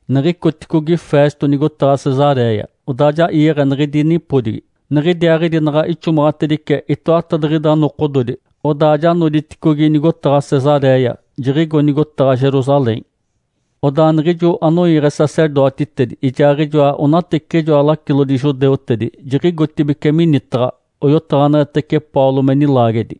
Niɡ̶icoticogi Festo nigotaɡ̶a Cesaréia, odaa ja iiɡ̶e niɡ̶idi nipodigi. Niɡ̶idiaaɡ̶idi naɡ̶a ixomaɡ̶atedice itoatadiɡ̶ida nokododi, odaa ja noditicogi nigotaɡ̶a Cesaréia, jiɡ̶igo nigotaɡ̶a Jerusalém. Odaa niɡ̶ijo anoiiɡ̶e sacerdotitedi ijaaɡ̶ijoa onateciɡ̶ijoa lacilodi judeutedi jiɡ̶igotibeci minitaɡ̶a, oyotaɡ̶aneɡ̶etece Paulo me nilaagedi.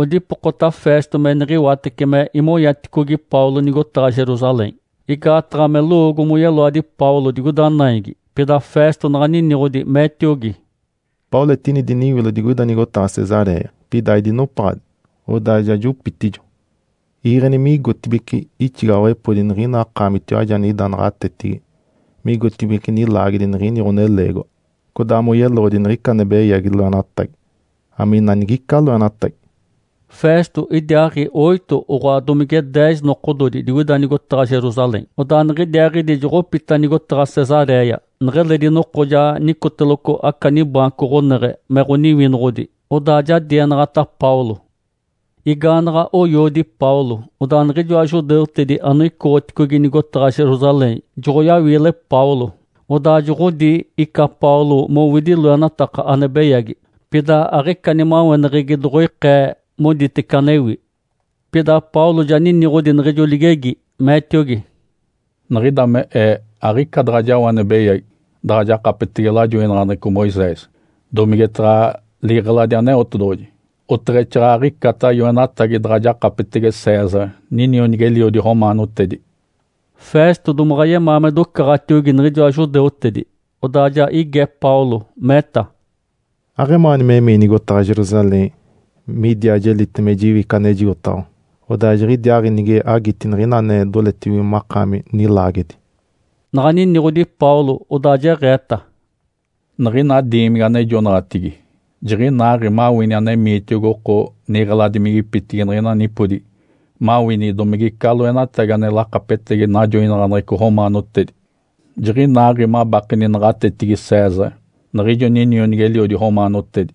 Odipokota Festo me niɡ̶iwatece me imonyaticogi Paulo nigotaɡ̶a Jerusalém, igaataɡ̶a me lowoogo moyeloadi Paulo digoida naigi. Pida Festo naɡ̶a niniɡ̶odi, meetiogi, “Paulo etini diniwilo digoida nigotaɡ̶a Cesaréia, pida aidinopaɡ̶adi, odaa ja jopitijo. Iiɡ̶eni migotibeci ixigaɡ̶awepodi niɡ̶ina akaamitiwaji anida naɡ̶atetigi migotibeci nilaagedi niɡ̶ini ɡ̶oneleegiwa, codaa moyeloɡ̶odi niɡ̶ica ane beyagi loenatagi, amina nigica loenatagi.” Festo idiaaɡ̶i oito oɡ̶oa domige deez nokododi digoida nigotaɡ̶a Jerusalém, odaa niɡ̶idiaaɡ̶idi joɡ̶opita nigotaɡ̶a Cesaréia. Neɡ̶eledi noko ja nicoteloco aca nibaanco ɡ̶oneɡ̶e me ɡ̶oniwinoɡ̶odi, odaa ja dienaɡ̶ata Paulo. Igaanaɡ̶a oyoodi Paulo, odaa niɡ̶ijoa judeutedi anoicoɡ̶oticogi nigotaɡ̶a Jerusalém joɡ̶oyawiile Paulo, odaa joɡ̶odi ica Paulo mowidi loenataka ane beyagi. Pida aɡ̶ica nimaweneɡ̶egi doɡ̶oikee moditece anewi. Pida Paulo ja niniɡ̶odi niɡ̶ijo ligegi, meetiogi, “Niɡ̶ida me ee aɡ̶ica daɡ̶a jao ane beyagi daɡ̶a jakapetege lajoinaɡ̶aneɡ̶eco Moisés, domigetaɡ̶a liɡ̶eladi Aneotedoɡ̶oji, oteɡ̶exaaɡ̶aɡ̶icata yoenatagi daɡ̶a jakapetege César, ninionigi-eliodi romaanotedi.” Festo domaɡ̶a yemaa me docaɡ̶atiogi niɡ̶ijoa judeutedi. Odaa ja ige Paulo, meeta, “Aɡ̶emaani memii nigotaɡ̶a Jerusalém midiaa jelite me jiwi ica anejigotaɡ̶awa? Odaa jiɡ̶idiaaɡ̶i nige agiti niɡ̶ina ane doletibige makaami nilaagedi.” Naɡ̶a niniɡ̶odi Paulo, odaa jeɡ̶eeta, “Niɡ̶ina diimigi anejonaɡ̶atigi jiɡ̶inaaɡ̶i mawini anemiitiogi oko niɡ̶eladimigipitigi niɡ̶ina nipodigi mawini domigica loenatagi ane lakapetegi najoinaɡ̶aneɡ̶eco romaanotedi. Jiɡ̶inaaɡ̶i mabakeni naɡ̶atetigi César, niɡ̶ijo ninionigi-eliodi romaanotedi,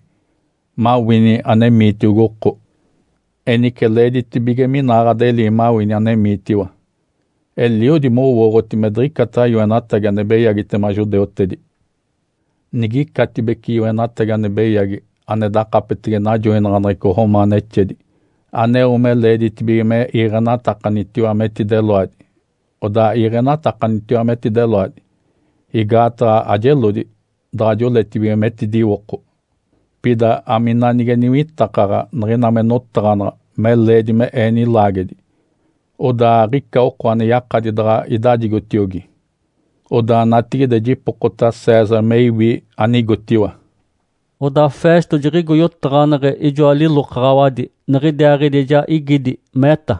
mawini anemiitiogi oko. Enice leeditibige minaaɡ̶adelii mawini anemiitiwa. Eliodi mowooɡ̶oti me diɡ̶icata yoenatagi ane beyagitema judeutedi. Nigicatibece yoenatagi ane beyagi ane dakapetege najoinaɡ̶aneɡ̶eco romaanexedi aneo me leeditibige me iiɡ̶enatakanitiwa metideloadi, odaa iiɡ̶enatakanitiwa metideloadi, igaataɡ̶a ajelodi daɡ̶a joletibige metidiwoko. Pida amina nige niwitakaɡ̶a niɡ̶ina me notaɡ̶anaɡ̶a me leedi me ee nilaagedi, odaa aɡ̶ica oko ane yakadi daɡ̶a idajigotiogi. Odaa natigide jipokota César me iwi anigotiwa.” Odaa Festo jiɡ̶igo yotaɡ̶aneɡ̶e ijoa lilokaɡ̶awadi, niɡ̶idiaaɡ̶idi ja igidi, meeta,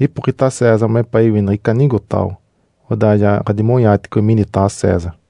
“Ipokita César mepaa iwi niɡ̶ica anigotaɡ̶awa, odaa ja ɡ̶adimonyaaticogi minitaɡ̶a César!”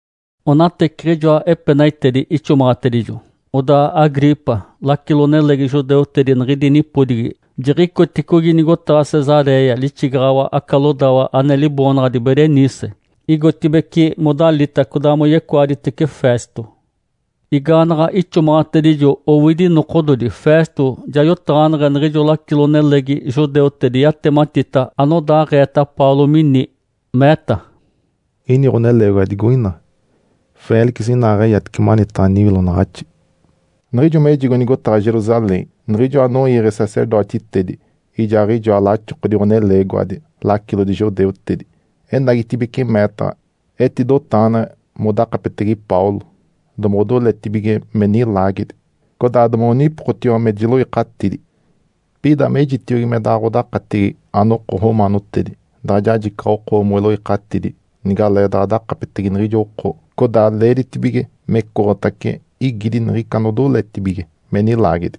Onateciɡ̶ijoa epenaitedi ixomaɡ̶atedijo, odaa Agripa, lacilo-nelegi judeutedi niɡ̶idi nipodigi, jiɡ̶icoticogi nigotaɡ̶a Cesaréia, lixigaɡ̶awa aca lodawa ane liboonaɡ̶adi Berenice, igotibeci modalita codaa moyecoaditece Festo. Igaanaɡ̶a ixomaɡ̶atedijo owidi nokododi, Festo ja yotaɡ̶aneɡ̶e niɡ̶ijo lacilo-nelegi judeutedi yatematita anodaaɡ̶eeta Paulo mini, meeta, “Ini ɡ̶oneleegiwa digoina Félix inaaɡ̶eyatice manitaɡ̶a niwiloɡ̶onaɡ̶axi. Niɡ̶ijo mejigo nigotaɡ̶a Jerusalém, niɡ̶ijo anoiiɡ̶e sacerdotitedi ijaaɡ̶ijoa laxokodi ɡ̶oneleegiwadi lacilodi judeutedi enagitibeci meetaɡ̶a. Etidotaɡ̶aneɡ̶e modakapetege Paulo domoɡ̶odoletibige me nilaagedi, codaa domoɡ̶onipokotiwa me jiloikatidi. Pida mejitiogi me daɡ̶a ɡ̶odakatigi anoko romaanotedi daɡ̶a jajicaɡ̶a oko moiloikatidi nigaleedaɡ̶a dakapetege niɡ̶ijo oko codaa leeditibige mecoɡ̶otace igidi niɡ̶ica anodoletibige me nilaagedi.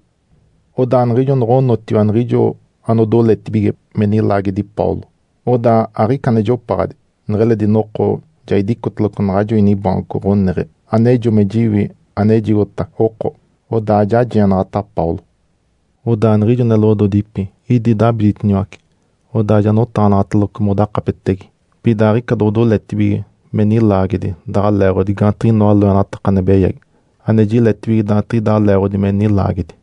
Odaa niɡ̶ijo noɡ̶onotiwa niɡ̶ijo anodoletibige me nilaagedi Paulo, odaa aɡ̶ica ane jopaɡ̶adi, neɡ̶eledi noko ja idicoteloco naɡ̶ajo inibaanco ɡ̶oneɡ̶e anejo me jiwi anejigota oko. Odaa ja jienaɡ̶ata Paulo. Odaa niɡ̶ijo neloɡ̶ododipi idi dabiditiniwace, odaa ja notaɡ̶anaɡ̶ateloco modakapetege. Pida aɡ̶ica doɡ̶odoletibige me nilaagedi daɡ̶a leeɡ̶odi gaantiɡ̶inoa loenataka ane beyagi ane jiletibige daantiɡ̶idaa leeɡ̶odi me nilaagedi.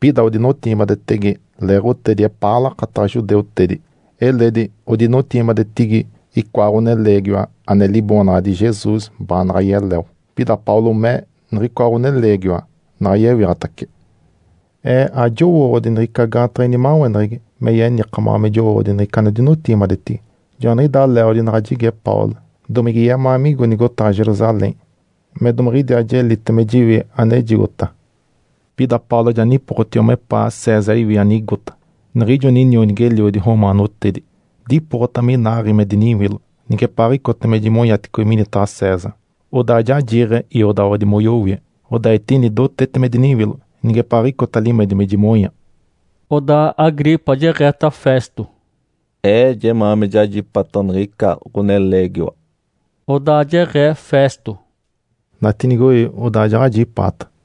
Pida odinotigimadetege leeɡ̶otedi epaa lakataɡ̶a judeutedi. Eledi odinotigimadetigi icoa ɡ̶oneleegiwa ane liboonaɡ̶adi Jesus baanaɡ̶a yeleo, pida Paulo mee niɡ̶icoa ɡ̶oneleegiwa naɡ̶a yewiɡ̶atace. Ee ajowooɡ̶odi niɡ̶ica gaantaɡ̶a inimaweneɡ̶egi me yenikamaɡ̶a me jowooɡ̶odi niɡ̶ica anodinotigimadetigi. Joaniɡ̶idaa leeɡ̶odi naɡ̶a jige Paulo domige yemaa migo nigotaɡ̶a Jerusalém me domiɡ̶idiaa jelite me jiwi anejigota. Pida Paulo ja nipokotiwa mepaa César iwi anigota, niɡ̶ijo ninionigi-eliodi romaanotedi. Dipokota minaaɡ̶i me diniwilo nigepaaɡ̶icota me jimonyaticogi minitaɡ̶a César. Odaa ja jiiɡ̶e iodaɡ̶awadi moyowie, odaa etini dotete me diniwilo nigepaaɡ̶icota limedi me jimonya.” Odaa Agripa jeɡ̶eeta Festo, “Ee jemaa me jajipata niɡ̶ica ɡ̶oneleegiwa.” Odaa jeɡ̶ee Festo, “Natiinigoi, odaa jaɡ̶ajipaata.”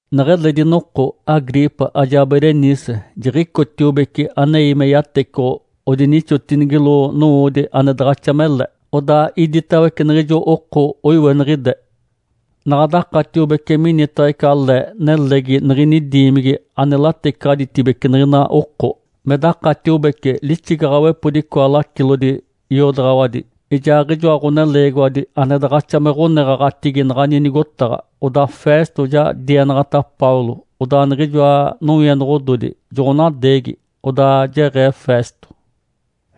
Neɡ̶eledi noko Agripa ajaa Berenice jiɡ̶icotiobece anei me yatecoɡ̶o odinixotinigilo nowoodi ane daɡ̶axa mele, odaa iditawece niɡ̶ijo oko oiweniɡ̶ide. Naɡ̶a dakatiobece minitaɡ̶a ica le nelegi niɡ̶ini diimigi ane latecaɡ̶aditibece niɡ̶ina oko. Me dakatiobece lixigaɡ̶awepodi icoa lacilodi iodaɡ̶awadi ijaaɡ̶ijoa ɡ̶oneleegiwadi ane daɡ̶axa me ɡ̶oneɡ̶aɡ̶atigi naɡ̶ani nigotaɡ̶a. Odaa Festo ja dienaɡ̶ata Paulo, odaa niɡ̶ijoa nowienoɡ̶ododi joɡ̶onadeegi. Odaa jeɡ̶ee Festo,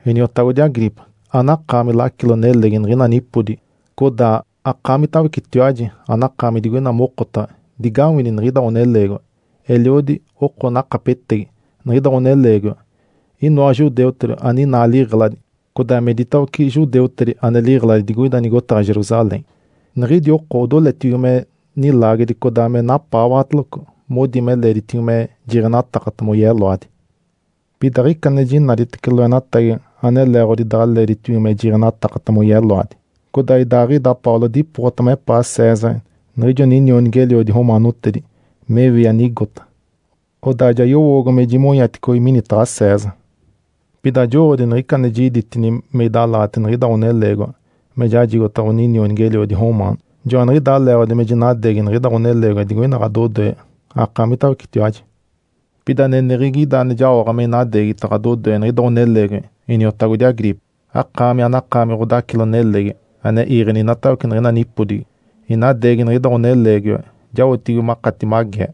“Iniotagodi Agripa, anakaami lacilo-nelegi niɡ̶ina nipodigi, codaa akaamitawecetiwaji anakaami digoina mokotaɡ̶a, digawini niɡ̶ida ɡ̶oneleegiwa. Eliodi oko nakapetegi niɡ̶ida ɡ̶oneleegiwa, inoa judeutedi aninaa liɡ̶eladi, codaa me iditawece judeutedi ane liɡ̶eladi digoida nigotaɡ̶a Jerusalém. Niɡ̶idi oko odoletibige me nilaagedi codaa me napaawaɡ̶ateloco, modi me leeditibige me jiiɡ̶enatakata moyeloadi. Pida aɡ̶ica ane jinaditece loenatagi ane leeɡ̶odi daɡ̶a leeditibige me jiiɡ̶enatakata moyeloadi. Codaa idaaɡ̶ida Paulo dipokota mepaa César, niɡ̶ijo ninionigi-eliodi romaanotedi me iwi anigota. Odaa ja yowoogo me jimonyaticogi minitaɡ̶a César. Pida ajowooɡ̶odi niɡ̶ica ane jiditini me idalaɡ̶ata niɡ̶ida ɡ̶oneleegiwa me jajigota ɡ̶oninionigi-eliodi romaano. Joaniɡ̶idaa leeɡ̶odi me jinadeegi niɡ̶ida ɡ̶oneleegiwa digoina ɡ̶adodoe akaamitawecetiwaji. Pida aneneɡ̶egi ida ane jaoɡ̶a me inadeegita ɡ̶adodoe niɡ̶ida ɡ̶oneleegiwa, iniotagodi Agripa, akaami anakaami ɡ̶odacilo-nelegi ane iiɡ̶eni inatawece niɡ̶ina nipodigi. Inadeegi niɡ̶ida ɡ̶oneleegiwa jaotibige makati magee,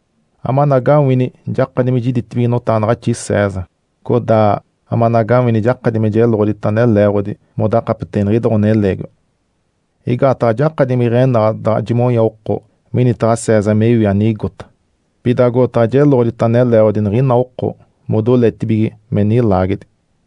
amanagawini jakadi me jiditibige notaɡ̶anaɡ̶axi César, codaa amanagawini jakadi me jeloɡ̶odita ane leeɡ̶odi modakapetege niɡ̶ida ɡ̶oneleegiwa. Igaataɡ̶a ajakadi me iɡ̶enaɡ̶a daɡ̶a jimonya oko minitaɡ̶a César me iwi anigota, pida agotaɡ̶a jeloɡ̶odita ane leeɡ̶odi niɡ̶ina oko modoletibige me nilaagedi.”